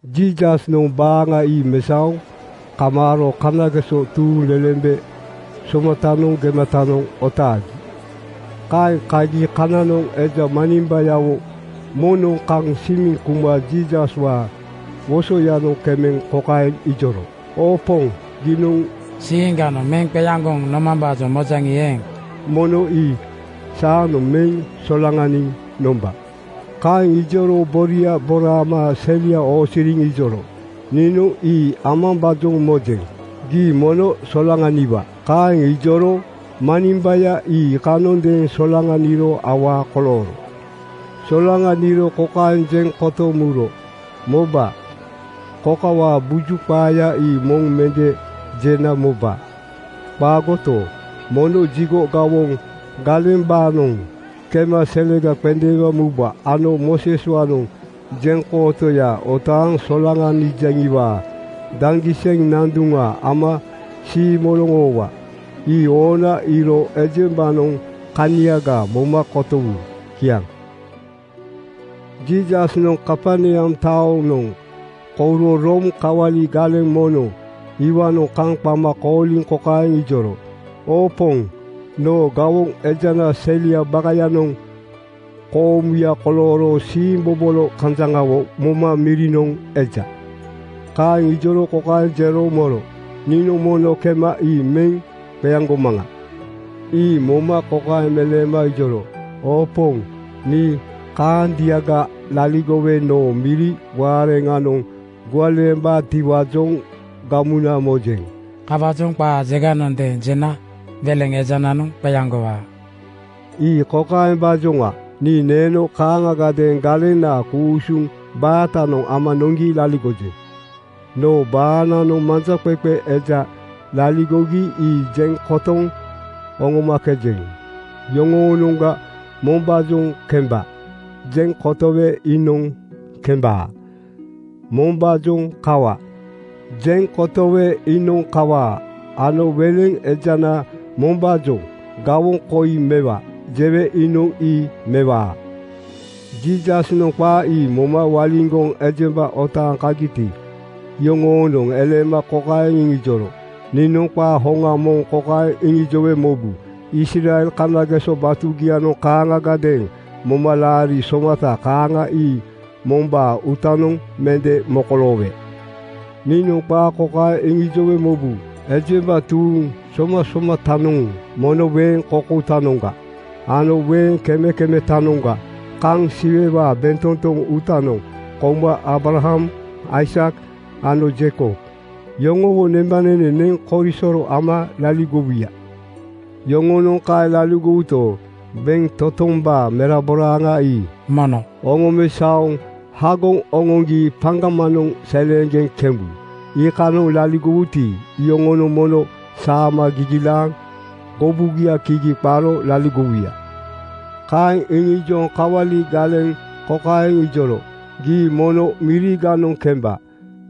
Jiisasnoŋ baaŋa ii mesaoŋ kamaaro kanageso tuuŋlelembe somatanoŋ gematanoŋ otaagi. Kaeŋ kagi kanoŋ eja manimbayawo moŋnoŋ kaŋ simiŋ kuma Jiisaswaa wosoyanoŋ kemeŋ kokaeŋ ijoro, “Oo Poŋ, giinoŋ siiŋganoŋ meŋ qeaŋgoŋ nomambaajoŋ mojaŋi eeŋ, mono nii saanoŋ meŋ solaŋaniŋ nomba.” Kaeŋ ijoro boria boraama selia oosiriŋ ijoro, “Niinoŋ ii amambaajoŋ mojeŋ. Gii mono solaŋaniwa.” Kaeŋ ijoro manimbaya ii iikanondeeŋ solaŋaniro awaa kolooro. Solaŋaniro kokaeŋ jeŋ kotoŋ muro, “Moba, kokawaa buju qaaya ii moŋ mende jena moba. Qaagoto, mono jigo gawoŋ galembaanoŋ kema selega qendeema muba ano Mooseswaanoŋ jeŋkootoya otaaŋ solaŋanijaŋiwaa daŋgiseŋ nanduŋa ama siimoloŋ oowa. Ii oona iiro ejembanoŋ kaniaga moma kotowu.” Kiaŋ. Jiisasnoŋ Kaperneam taonoŋ kouro Room kawali galeŋ moŋnoŋ iwaanoŋ kaŋ qama kooliŋ kokaeŋ ijoro, “Oo Poŋ, noo gawoŋ ejanaa seliaa bakayanoŋ koomuya kolooro siimbobolo kanjaŋawo moma mirinoŋ eja.” Kaeŋ ijoro kokaeŋ jero moro, “Niinoŋ mono kema ii meŋ qeaŋgomaŋa.” Ii moma kokaeŋ meleema ijoro, “Oo Poŋ, nii kaandiaga laligowe noo miri waareŋanoŋ gualeembaatiwaajoŋ gamuna mojeŋ. Kawaajoŋ qaa jeganondeeŋ jena weleŋ ejananoŋ qeaŋgowaa. Ii kokaembaajoŋa: Nii neeno kaaŋagadeeŋ galenaa ku-usuŋ baatanoŋ ama noŋgi laligojeŋ. Noo baananoŋ manjaqeqe eja laligogi ii jeŋ kotoŋ oŋomakejeŋ. Yoŋoonoŋga mombaajoŋ ‘Kemba,’ jeŋ kotowe iinoŋ kembaa. Mombaajoŋ ‘Kawa,’ jeŋ kotowe iinoŋ kawaa ano weleŋ ejana mombaajoŋ ‘Gawoŋ koi mewa,’ jewe iinoŋ ii mewaa.” Jiisasnoŋ qaa ii moma waliŋgoŋ ejemba otaaŋ kagiti, iyoŋoonoŋ eleema kokaeŋ iŋijoro, “Niinoŋ qaa hoŋa moŋ kokaeŋ iŋijowe mobu: Israel kanageso batugianoŋ kaaŋagadeeŋ momalaari somata kaaŋa ii mombaa uutanoŋ mende mokoloowe. Niinoŋ qaa kokaeŋ iŋijowe mobu: Ejemba tuuŋ somasomatanoŋ mono weeŋ koukoutanoŋga ano weeŋ kemekemetanoŋga kaŋ Siwewaa bentotoŋ uutanoŋ kouma Aabraham, Aisak ano Jeikob yoŋowo nembanene neŋ korisoro ama laligowuya. Yoŋonoŋ kaeŋ laligowuto, bentotombaa meraboraaŋa ii mono oŋomesaoŋ hagoŋ oŋoŋgi paŋgamanoŋ seleeŋgeŋ kemebu. Iikanoŋ laligowuti, iyoŋonoŋ mono saama gigilaaŋ gobugia kigi qaro laligowuya.” Kaeŋ iŋijoŋ kawali galeŋ kokaeŋ ijoro, “Gii mono miriganoŋ kemba.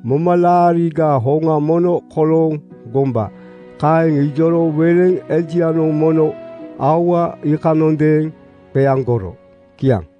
Momalaarigaa hoŋa mono kolooŋ gomba.” Kaeŋ ijoro weleŋ ejianoŋ mono aua iikanondeeŋ qeaŋgoro. Kiaŋ.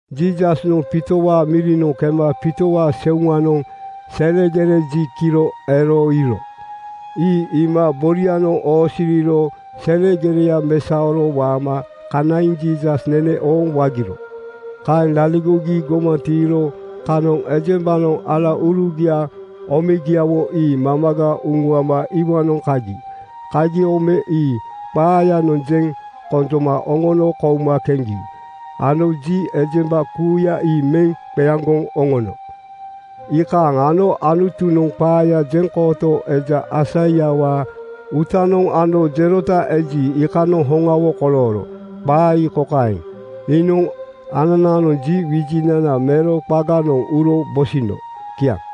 Jiisasnoŋ Piitowaa mirinoŋ kema Piitowaa seuŋanoŋ selegere ji kiro ero iiro. Ii iima borianoŋ oosiriro selegereya mesaoro waama kanaiŋ Jiisas nene ooŋ wagiro. Kaeŋ laligogi gomaŋ tiiro kanoŋ ejembanoŋ alaurugia omegiawo ii mamaga uŋuama iwaanoŋ kagi. Kagi ome ii qaayanoŋ jeŋ konjoma oŋono kouma keŋgi ano ji ejemba kuuya ii meŋ qeaŋgoŋ oŋono. Iikaaŋ ano Anutunoŋ qaaya gejatootoo eja Aisaiawaa uutanoŋ ano jerota eji, iikanoŋ hoŋawo kolooro. Qaa ii kokaeŋ, “Iinoŋ ananaanoŋ ji wijinana mero qaganoŋ uro bosino.” Kiaŋ.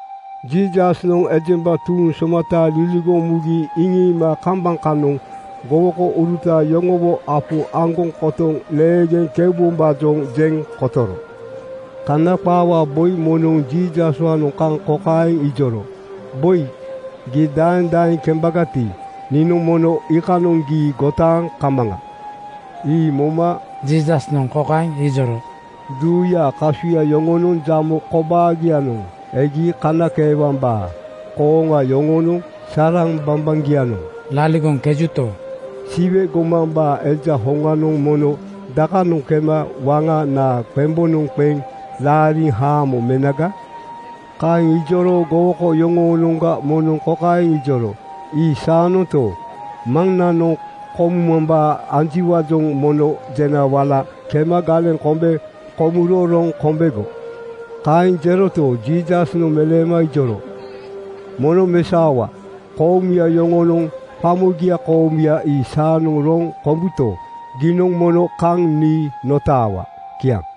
Jiisasnoŋ ejemba tuuŋ somata liligoŋ mugi iŋiima kambaŋ kanoŋ gowokouruta yoŋowo apu aŋgoŋ kotoŋ leegeŋ keubombaajoŋ jeŋ kotoro. Kana qaawaa boi moŋnoŋ Jiisaswaanoŋ kaŋ kokaeŋ ijoro, “Boi, gii daeŋ daeŋ kembagati, niinoŋ mono iikanoŋ gii gotaaŋ kamaŋa.” Ii moma Jiisasnoŋ kokaeŋ ijoro, “Duuyaa kasuya yoŋonoŋ jamo kobaagianoŋ egi kanakeewambaa kooŋa yoŋonoŋ saraŋ bambaŋgianoŋ laligoŋkejuto, Siwe gomambaa Eja hoŋanoŋ mono dakanoŋ kema waŋa naa qembonoŋ qeŋ laariŋ haamo menaga?” Kaeŋ ijoro gowoko yoŋoonoŋga moŋnoŋ kokaeŋ ijoro, “Ii saanonto, maŋnanoŋ komumambaa anjiwaajoŋ mono jena wala kema galeŋ kombe komuro roŋ kombego.” Kaeŋ jeroto, Jiisasnoŋ meleema ijoro, “Mono mesaowa, koomuya yoŋonoŋ qamogia koomuya ii saanoŋ roŋ kombuto, giinoŋ mono kaŋ nii notaawa.” Kiaŋ.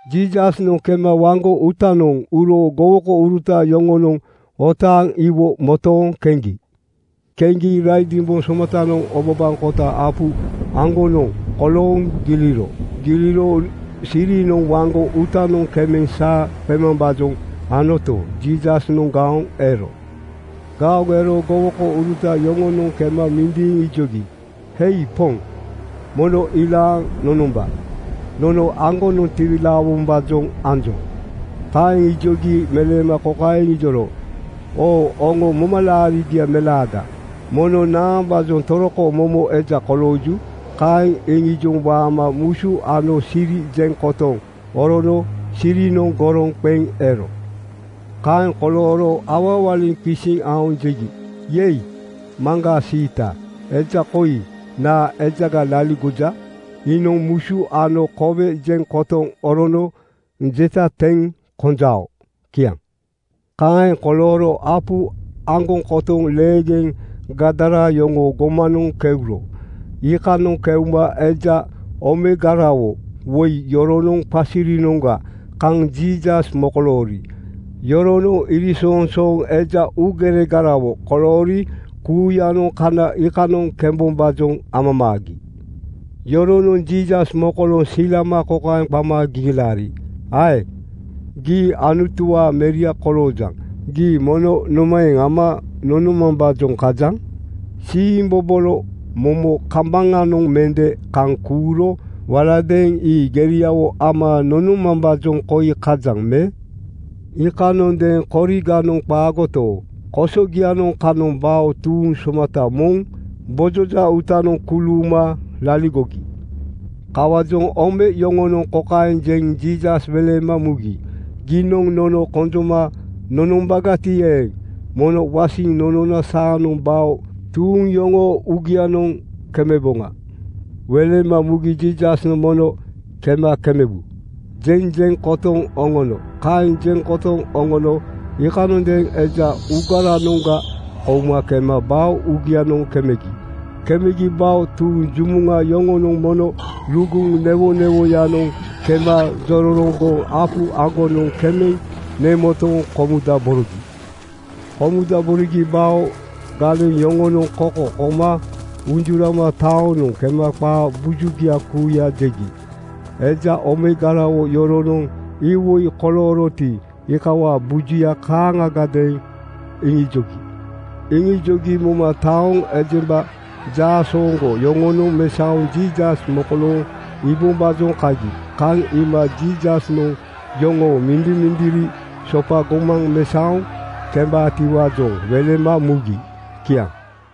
Jiisasnoŋ kema waŋgo uutanoŋ uro gowokouruta yoŋonoŋ otaaŋ iwo motooŋ keŋgi. Keŋgi raidimboŋ somatanoŋ obabaŋkota apu aŋgonoŋ kolooŋ giliro. Giliro sirinoŋ waŋgo uutanoŋ kemeŋ saa qemambaajoŋ anoto, Jiisasnoŋ gaoŋ ero. Gaoŋ ero gowokouruta yoŋonoŋ kema mindiiŋ ijogi, “Hei Poŋ, mono ilaaŋ nonomba. Nono aŋgonoŋ tiwilaawombaajoŋ anjoŋ.” Kaeŋ ijogi meleema kokaeŋ iŋijoro, “Oo oŋo momalaarigia melaada, mono naambaajoŋ toroko momo eja kolooju?” Kaeŋ iŋijoŋ waama musu ano siri jeŋ kotoŋ orono sirinoŋ goroŋ qeŋ ero. Kaeŋ kolooro awawaliŋ qisiŋ aoŋ jegi, “Yei, maŋgaa siita! Eja koi naa ejaga laligoja? Iinoŋ musu ano kowe jeŋ kotoŋ orono jeta teŋ konjao.” Kiaŋ. Kaeŋ kolooro apu aŋgoŋ kotoŋ leegeŋ Gadara yoŋoo gomanoŋ keuro. Iikanoŋ keuma eja omegarawo woi yoronoŋ qasirinoŋga kaŋ Jiisas mokoloori. Yoronoŋ iriŋsoŋsooŋ eja uugeregarawo koloori kuuyanoŋ kana iikanoŋ kembombaajoŋ amamaagi. Yoronoŋ Jiisas mokolooŋ silama kokaeŋ qama gigilaari, “Ae! Gii Anutuwaa Meria koloojaŋ. Gii mono nomaeŋ ama nonomambaajoŋ kajaŋ? Siimbobolo momo kambaŋanoŋ mende kaŋ kuuro waladeeŋ ii geriawo ama nonomambaajoŋ koi kajaŋ me?” Iikanondeeŋ koriganoŋ qaagoto, kosogianoŋ kanoŋ bao tuuŋ somata moŋ gbojoja uutanoŋ kuluuma laligogi. Kawaajoŋ ome yoŋonoŋ kokaeŋ jeŋ Jiisas welema mugi, “Giinoŋ nono konjoma nonombagati eeŋ, mono wasiŋ nonona saanoŋ bao tuuŋ yoŋoo uugianoŋ kemeboŋa.” Welema mugi Jiisasnoŋ “Mono kema kemebu,” jeŋ jeŋ kotoŋ oŋono. Kaeŋ jeŋ kotoŋ oŋono iikanondeeŋ eja uugaranoŋga kouma kema bao uugianoŋ kemegi. Kemegi bao tuuŋ jumuŋa yoŋonoŋ mono luguŋ newonewoyanoŋ (siasiayanoŋ) kema jororoŋgoŋ apu aŋgonoŋ kemeŋ nemotoŋ komudaborogi. Komudaborogi bao galeŋ yoŋonoŋ koko koma unjurama taonoŋ kema qaa bujugia kuuya jegi. Eja omegarawo yoroonoŋ iwoi kolooroti, iikawaa bujuya kaaŋagadeeŋ iŋijogi. Iŋijogi moma taoŋ ejemba jaasooŋgo yoŋonoŋ mesaoŋ Jiisas mokolooŋ iibombaajoŋ kagi. Kaŋ iima Jiisasnoŋ yoŋoo mindimindiri sopa gomaŋ mesaoŋ kembaatiwaajoŋ welema mugi. Kiaŋ.